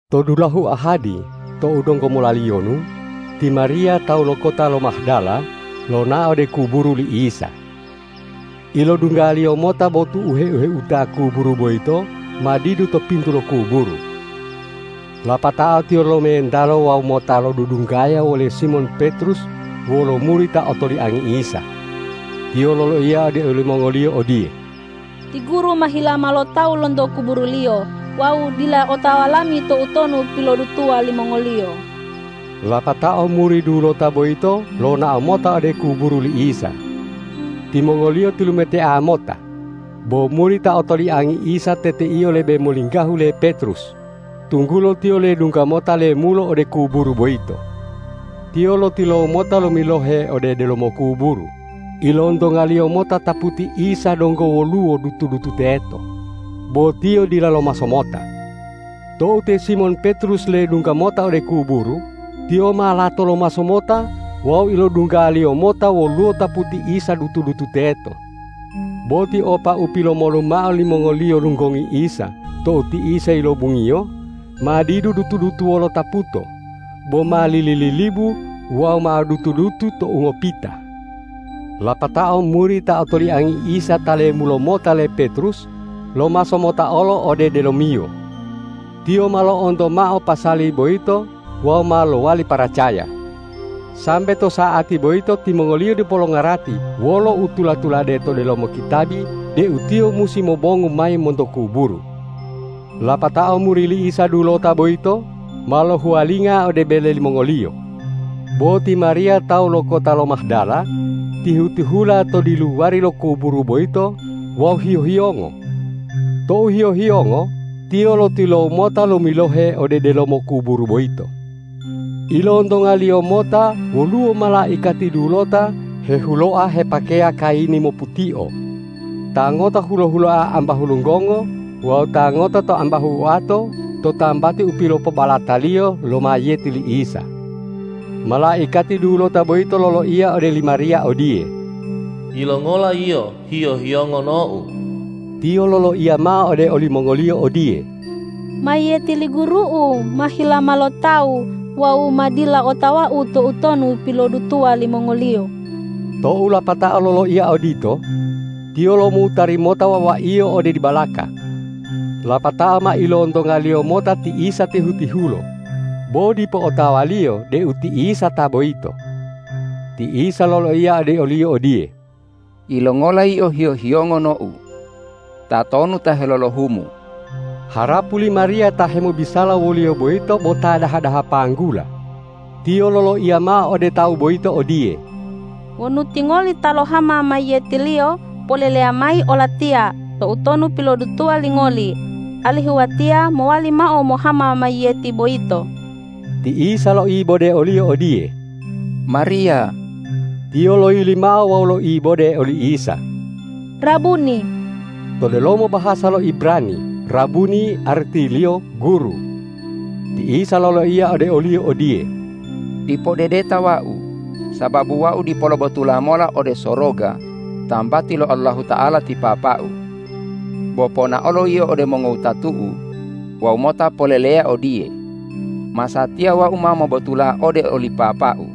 To dulahu ahadi tou donggo molaliyonu, ti Mariya tawu lo kota lo Mahdala lonao ode kuburu li Isa. Ilodunggaliyo mota botu u heu-heuta kuburu boyito ma didu to pintu lo kuburu. Lapatao tiyo lomentalo wawu mota lodudunggaya wole Simon Petrus wolo muri ta otoliangi Isa. Tiyo loloiya ode olimongoliyo odiye,”Ti Guru ma hilama lo tawu lonto kuburu-Liyo wawu dila otawa lami toutonu pilodutuwa limongoliyo.” Lapatao muri dulota boyito lonao mota ode kuburu li Isa. Timongoliyo tilumetea mota, bo muri ta otoliangi Isa teteiyo lebe molinggahu le Petrus, tunggulo tiyo ledungga mota lemulo ode kuburu boyito. Tiyo lotilowu mota lomilohe ode delomo kuburu, ilontongaliyo mota taputi Isa donggo woluwo dutu-dutu teto, bo tiyo dila lomaso mota. Tou te Simon Petrus ledungga mota ode kuburu, tiyo ma lato lomaso mota wawu ilodunggaliyo mota woluwo taputi Isa dutu-dutu teto. Bo tiopa u pilomolu mao limongoliyo lunggongi Isa tou ti Isa yilobungiyo, ma didu dutu-dutu wolo taputo, boma lili-lilibu wawu mao dutu-dutu to ungopita. Lapatao muri ta otoliangi Isa ta lemulo mota le Petrus lomaso mota olo ode delomiyo. Tiyo ma lo'onto mao pasali boyito wawu ma lowali paracaya. Sambe to sa'ati boyito timongoliyo dipo longarati wolo u tula-tulade to delomo kitabi deu Tiyo musi mobongu mayi monto kuburu. Lapatao muri li Isa dulota boyito ma lohuwalinga ode bele limongoliyo. Bo ti Mariya tawu lo kota lo Mahdala tihu-tihula to diluwari lo kuburu boyito wawu hiyo-hiyongo. Tou hiyo-hiyongo, tiyo lotilowu mota lomilohe ode delomo kuburu boyito. Ilontongaliyo mota woluwo malaikati dulota hehuloa hepakeya kayini moputio. Ta ngota hulo-huloa ambahu lunggongo wawu ta ngota to ambahu oato to tambati u pilopobalataliyo lo mayiyeti Isa. Malaikati dulota boyito loloiya ode li Mariya odiye,”Yilongola yio hiyo-hiyongo, nou?” Tiyo loloiya mao ode olimongoliyo odiye,”Mayiyeti li Guru'u ma hilama lo tawu wawu ma dila otawau toutonu pilodutuwa limongoliyo.” Tou lapatao loloiya odito, tiyo lomutari mota wawaiyo ode dibalaka. Lapatao ma ilontongaliyo mota ti Isa tihu-tihulo, bo dipo otawaliyo deu ti Isa ta boyito. Ti Isa loloiya ode oliyo odiye,”Yilongola yio hiyo-hiyongo, nou? Tatonu ta helolohumu?” Harapu li Mariya ta hemobisala woliyo boyito bo ta daha-daha panggula, tiyo loloiya mao ode tawu boyito odiye,”Wonu tingoli ta lohama mayiyeti-Liyo, poleleya mayi olatiya, toutonu pilopodutuwa lingoli, alihu watiya mowali mao mohama mayiyeti boyito.” Ti Isa loibode oliyo odiye,”Mariya!” Tiyo loyili mao wawu loibode oli Isa,”Rabuni!” To delomo bahasa lo Ibrani rabuni artiliyo guru. Ti Isa loloiya ode oliyo odiye,”Dipo dedeta Wau, sababu Wau dipo lobotula mola ode soroga tambati lo Allahuta'ala ti Papa-U. Bo ponaolo yio ode mongowutatu-U wawu mota poleleya odiye, ’Masatiya Wau ma mobotula ode oli Papa-U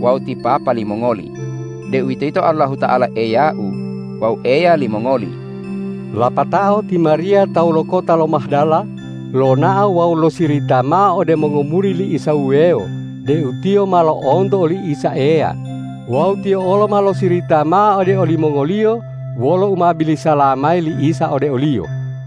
wawu ti Papa limongoli, deuwitoyito Allahuta'ala Eya-U wawu Eya limongoli.’” Lapatao ti Mariya tawu lo kota lo Mahdala lonao wawu losirita mao ode mongomuri li Isa wuwewo deu tiyo ma lo'onto oli Isa Eya wawu tiyo olo ma losirita mao ode olimongoliyo wolo u ma bilisala mayi li Isa ode oliyo.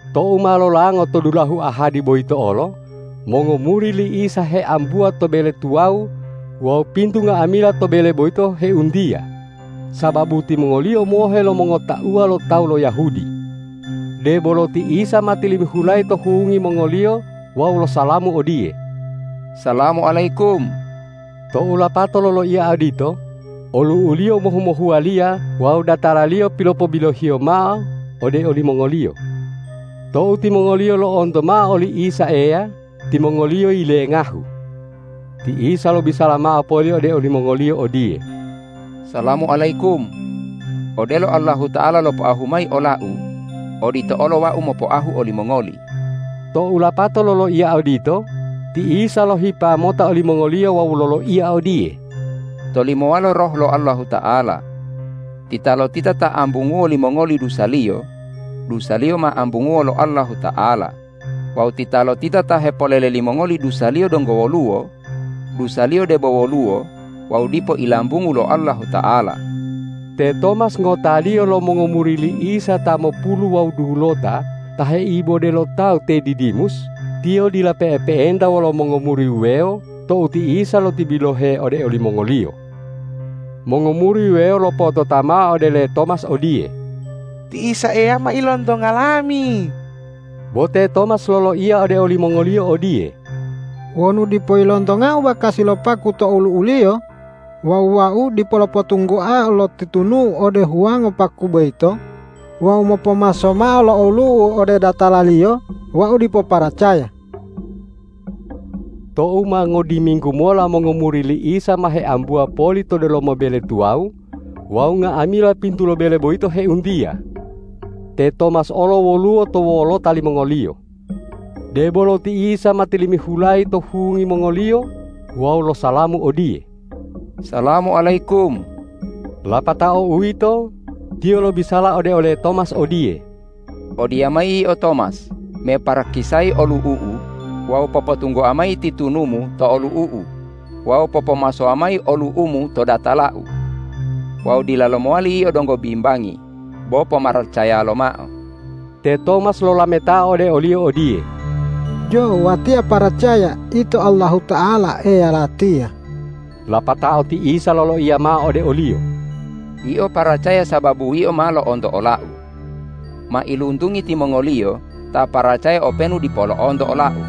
Tou ma lolango to dulahu ahadi boyito olo, mongomuri li Isa heambuwa to bele tuwawu wawu pintu nga'amila to bele boyito heuntiya, sababu timongoliyo mohe lo mongotauwa lo tawu lo Yahudi. Debolo ti Isa ma tilimihulayi to hungi mongoliyo wawu losalamu odiye,”Salamu alayikum!” Tou lapato loloiya odito, olu'u-Liyo mohu-mohuwaliya wawu datala-Liyo pilopobilo-Hiyo mao ode olimongoliyo. Tou timongoliyo lo'onto mao oli Isa Eya, timongoliyo yilengahu. Ti Isa lobisala mao poli ode olimongoliyo odiye,”Salamu alayikum. Odelo Allahuta'ala lopoahu mayi ola-U, odito olo Wau mopoahu olimongoli.” Tou lapato loloiya odito, ti Isa lohipa mota olimongoliyo wawu loloiya odiye,”Tolimowalo Roh lo Allahuta'ala. Titalotita ta ambunguwo limongoli dusaliyo, dusaliyo ma ambunguwo lo Allahuta'ala; wawu titalotita ta hepolele limongoli dusaliyo donggo woluwo, dusaliyo debo woluwo wawu dipo ilambungu lo Allahuta'ala.” Te Tomas ngotaliyo lo mongomuri li Isa ta mopulu wawu dulota ta heibode lo tawu te Didimus, tiyo dila pe'epe'enta wolo mongomuri wuwewo tou ti Isa lotibilohe ode olimongoliyo. Mongomuri wuwewo lopotota mao ode le Tomas odiye,”Ti Isa Eya ma ilontonga lami!” Bo te Tomas loloiya ode olimongoliyo odiye,”Wonu dipo ilontongau bakasi lo paku to olu'u-Liyo wawu wau dipo lopotunggoao lo titunu'u ode huwango paku boyito wawu mopomaso mao lo olu'u ode datala-Liyo, wau dipo paracaya.” Tou ma ngodiminggu mola mongomuri li Isa ma heambuwa poli to delomo bele tuwawu wawu nga'amila pintu lo bele boyito heuntiya. Te Tomas olo woluwo to wolota limongoliyo. Debolo ti Isa ma tilimihulayi to hungi mongoliyo wawu losalamu odiye,”Salamu alayikum.” Lapatao uwito, Tiyo lobisala ode ole Tomas odiye,”Odiyamayi yio Tomas me parakisayi olu'u-U wawu popotunggoa mayi titunumu to olu'u-U wawu popomasowa mayi olu'umu to datala-U. Wawu dilalo mowali yio donggo bimbangi. Bo pomaracaya lomao!” Te Tomas lolametao ode o-Liyo odiye,”Jo, watiya paracaya Ito Allahuta'ala Eya latiya.” Lapatao ti Isa loloiya mao ode oliyo,”Yio paracaya sababu yio ma lo'onto ola-U. Mailuntungi timongoliyo ta paracaya openu dipo lo'onto ola-U!”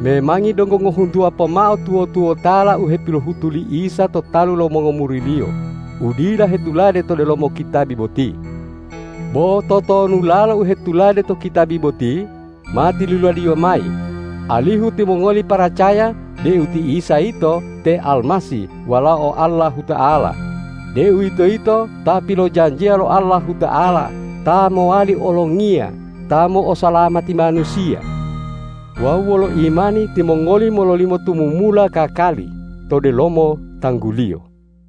Memangi donggo ngohuntuwa pomao tuwo-tuwotala u hepilohutu li Isa to talu lo mongomuri-Liyo u dila hetulade to delomo kitabi boti. Bo totonulalo u hetulade to kitabi boti ma tiluladiyo mayi, alihu timongoli paracaya deu ti Isa yito te Almasih Walao Allahuta'ala, deuwitoyito Ta pilojanjiya lo Allahuta'ala ta mowali Olongiya ta mo'osalamati manusiya. Wawu wolo imani timongoli mololimo tumumula kakali to delomo tanggu-Liyo.